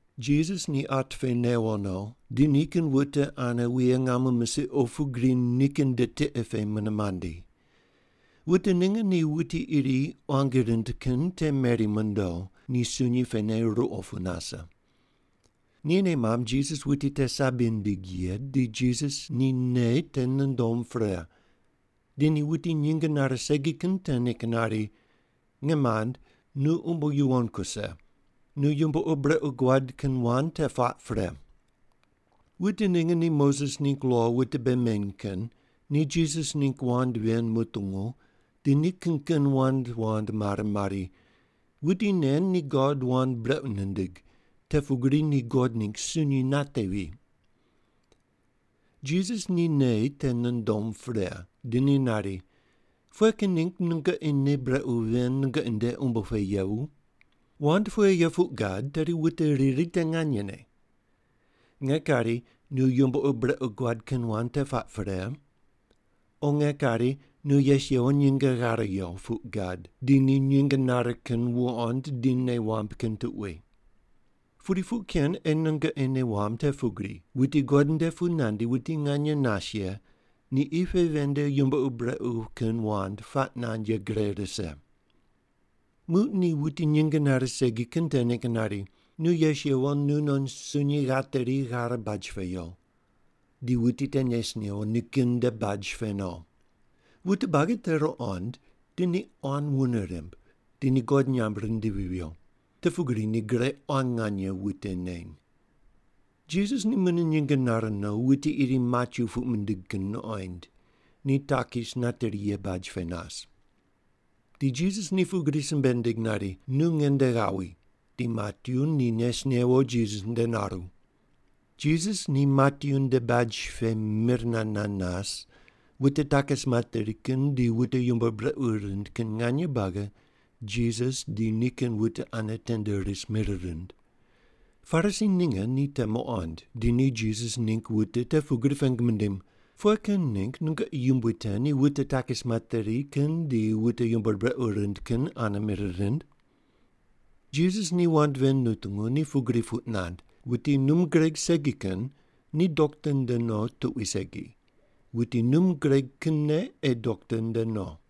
Jisas ni at pe newo no, di nikin wute ane wuye ngamo misiq opu gri nikin nde tiqe pe mune mandi. Wute ninge ni wuti iri quangi rind kin te meri mondo, ni sunyi pene ruqo pu nase. Ni nei mamb Jisas wuti te sabi nindig ye di Jisas ni nei te nundom pre, di ni wuti nyinge nare segi kin te ningg nari, “Nge mand, nu umbo yuwon kuse. Nu yumbo ur brequ guad kin wand te puaq pre.” Wute ninge ni Moses ningg lo wute bei meny kin ni Jisas ningg wand ven mutungu di ni kin kin wand wand mare mari, “Wuti nen ni God wand brequ nindig, te pugri ni God ningg sunyi natevi.” Jisas ni nei te nundom pre, di ni nari, “Pughe kin ningg nungoqi nei brequ ven nungoqi nde umbo pe yevu? Wand pughe ye puq gad tedi wute riri te nganyene: Nge kari, ‘Nu yumbo ur brequ guad kin wand te puaq pre,’ o nge kari, ‘Nu yes yewo nyinge ghare yo’ puq gad di ni nyinge nare kin wuqond di nei wamb kin tuqui? Pudi puq ken ei nungoqi nei wamb te pugri wuti God nde pu nandi wuti nganye nas ye ni qi pe ven nde yumbo ur brequ kin wand puaq nand ye gre rise.” Muq ni wuti nyinge nare segi kin te ningg nari, “Nu yes yewo, nunon sunyi ghateri, ghare baj pe yo.” Di wuti te nes newo, nikin nde baj pe no. Wute buagi ni te ruqond, di ni quan wune rimb, di ni God nyamb rindivi viyo. Te pugri ni gre quan nganye wute neny. Jisas ni mune nyinge nare no, wuti iri Matyu puq mindig kin nuqoind, ni takis nateri ye baj pe nas. Di Jisas ni pugri simbe nindig nari, “Nu nge nde ghawi.” Di Matyu ni nes newo Jisas nde naru. Jisas ni Matyu nde baj pe mir nand nand nas, wute takis materi kin di wute yumbo ur brequ rind kin nganye buagi Jisas di nikin wute ane tende ris mir rind. Parisi ninge ni te muqond, di ni Jisas ningg wute te pugri pengu mindim, “Pughe kin ningg nungoqi yumbui te ni wute takis materi kin di wute yumbo ur brequ rind kin ane mir rind?” Jisas ni wand ven nutungu, ni pugri puq nand, “Wuti num gureg segi kin ni dokta nde no tuqui segi, wuti num gureg kinne ei dokta nde no.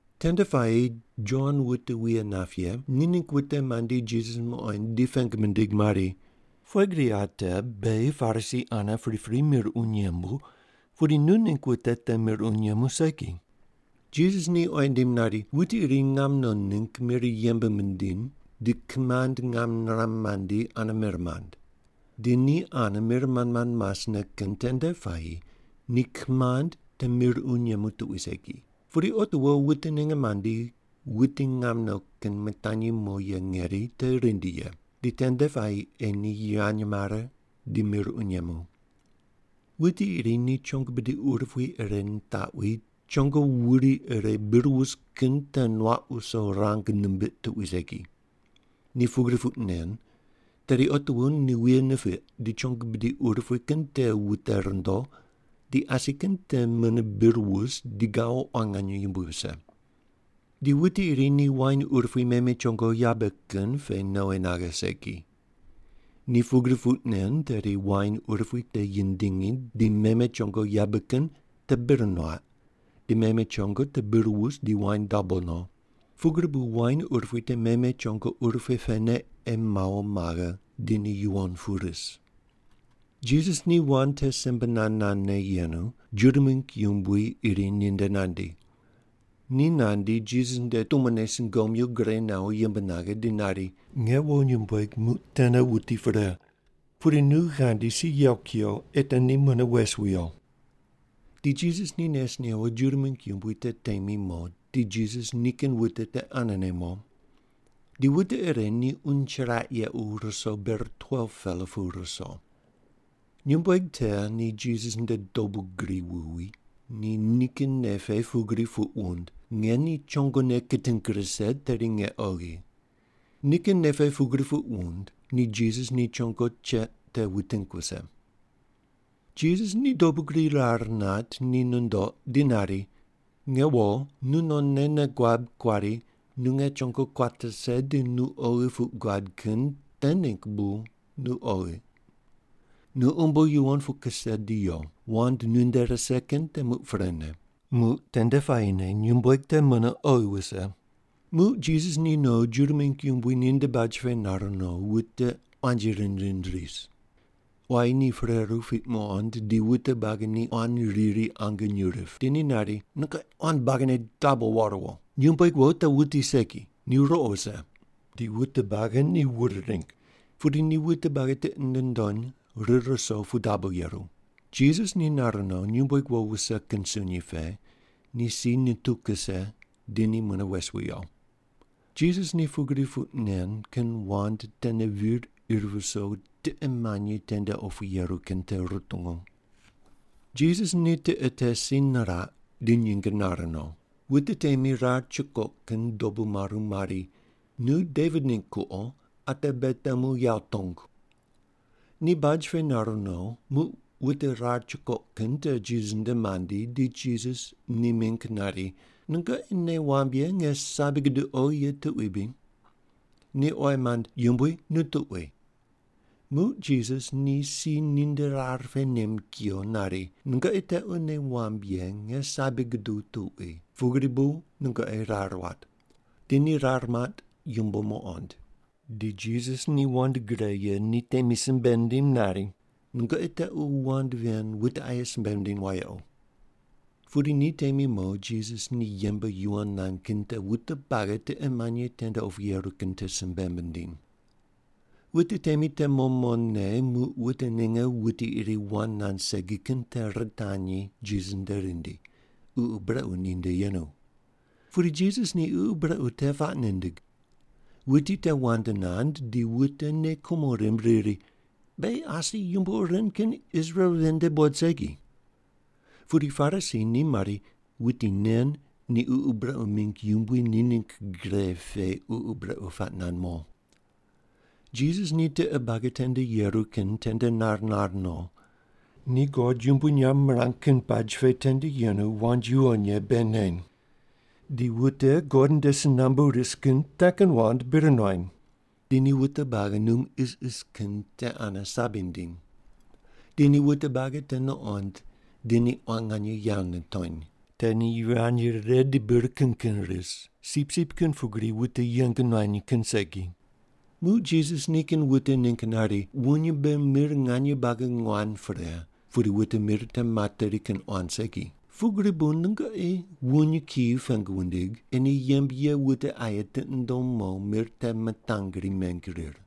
Tende puayi Jon wute wuye nap ye ni ningg wute mandi Jisas muqoind di pengu mindig mari, “Pughe gri ate beghi Parisi ane pripri mir uny yembu, pudi nu ningg wute te mir uny yemu segi?” Jisas ni oyi nindim nari, “Wuti iri ngam no ningg mir yembe mindiny di kimand ngam niram mandi ane mir mand. Di ni ane mir mand mand masne kin tende puayi ni kimand te mir uny yemu tuqui segi. Pudi otiwo wute ninge mandi wuti ngam no kin mitanyi mo ye ngeri te rindi ye. Di tende puayi ei ni yivany mare di mir uny yemu. Wuti iri ni chongo bidi urupui ire nitaqwi, chongo wuri ire bir wus kin pe nuaq wuso rang nimbiq tuqui segi. Ni pugri puq nen, tedi otiwo ni wuye nipiq di chongo bidi urupui kin te wute rundo, di asi kin te mune bir wus di gawo quan nganye yumbui wuse. Di wuti iri ni wain urupui meme chongo yabe kin pe nowi naghe segi. Ni pugri puq nen, tedi wain urupui te yindingi di meme chongo yabe kin te bir nuaq di meme chongo te bir wus di wain dabo no. Pugri bu wain urupui te meme chongo urupui pene ei mawo maghe di ni yuwon pu ris.” Jisas ni wand te simbe nand nandne yenu, Juda mingg yumbui iri ninde nandi. Ni nandi Jisas nde tumone sungomyu gure nawo yimb naghe, di nari, “Nge wo nyumbueg muq tene wuti pre. Pudi nu ghandi si yew kuyo ei te ni mune wes wiyo.” Di Jisas ni nes newo Juda mingg yumbui te temi mo, di Jisas nikin wute te anene mo. Di wute ire ni uny chiraq yequ ruso ber 12-pela pu ruso. Nyumbueg te ni Jisas nde dobu gri wuwi, ni nikin nei pe pugri puq wund, “Nge ni chongone kiting rise, tedi nge oghi.” Nikin nei pe pugri puq wund, ni Jisas ni chongo cheq te wuting wuse. Jisas ni dobu gri rar nat ni nundoq di nari, “Nge wo, nu nonne nei guab kuari nu nge chongo kuat rise di nu oghi ye puq guad kin te ningg bu nu oghi. Nu umbo yuwon pu kuse di yo, wand nunde rise kin te muq prene.” Muq tende puayine nyumbueg te mune oghi wuse. Muq Jisas ni no Juda mingg yumbui ninde baj pe nar no, wute quanji rind rind ris. Quayi ni pereru piq muqond di wute buagi ni quan riri ange nyuw rip, di ni nari, “Nungoqi quan buagine dabo war wo! Nyumbueg wo te wuti segi, ni ruqo wuse!” Di wute buagi ni wur ring. Pudi ni wute buagi tiqi nundony rir ruso pu dabo yeru. Jisas ni nar no, nyumbueg wo wuse kin sunyi pe, ni si nituw kuse, di ni mune wes wiyo. Jisas ni pugri puq nen kin wand tene vir ir viso tiqe manyi tende opu yeru kin te rutungu. Jisas ni tiqe te si niraq di nyinge nare no. Wute temi rar chukoq kin dobu maru mari, “Nu Devit ningg kuqo ate beghi temu yawo tongu.” Ni baj pe nar no, muq wute rar chukoq kin te Jisas nde mandi, di Jisas ni mingg nari, “Nungoqi nei wamb ye nge sabi guduq oghi ye tuqui bri?” Ni oyi mand, “Yumbui, nu tuqui.” Muq Jisas ni si ninde rar pe nem kuyo nari, “Nungoqi tequ nei wamb ye nge sabi guduq tuqui, pugri bu nungoqi rar wat.” Di ni rar mat yumbo muqond. Di Jisas ni wand gre ye ni temi simbe nindim nari, “Nungoqi tequ wand ven wute aye simbe wundiny wayequ.” Pudi ni temi mo, Jisas ni yembe yuwon nand kin te wute buagi tiqe manyi tende opu yeru kin te simbe mindiny. Wute temi te mo mone, muq wute ninge wuti iri wand nand segi kin te ritanyi Jisas nde rindi, ququ brequ ninde yenu. Pudi Jisas ni ququ brequ te puaq nindig. Wuti te wand nand, di wute nei kumo rimb riri, “Beghi asi yumbo ur ren kin Israel ven nde buqod segi.” Pudi Parisi ni mari, “Wuti nen ni ququ brequ mingg yumbui ni ningg gre pe ququ brequ puaq nand mo.” Jisas ni tiqe buagi tende yeru kin tende nar nar no. Ni God yumbui nyamb mirang kin baj pe tende yenu wand yuwon ye bei neny. Di wute God nde si nambu ris kin te kin wand bir nuany. Di ni wute buagi num isis kin te ane sabi nindiny. Di ni wute buagi te nuqond di ni quan nganye yawo nitony. Te ni yivany rire di bir kin kin ris, sipsip kin pugri wuti yeng nuany kin segi. Muq Jisas nikin wute ningg nari, “Wuny mbe mir nganye buagi nguan pre, pudi wute mir te materi kin quan segi. Pugri bu nungoqi wuny kiyi pengu wundig ei ni yembe ye wute aye tiqi nundom mo mir te mitangri meng rir.”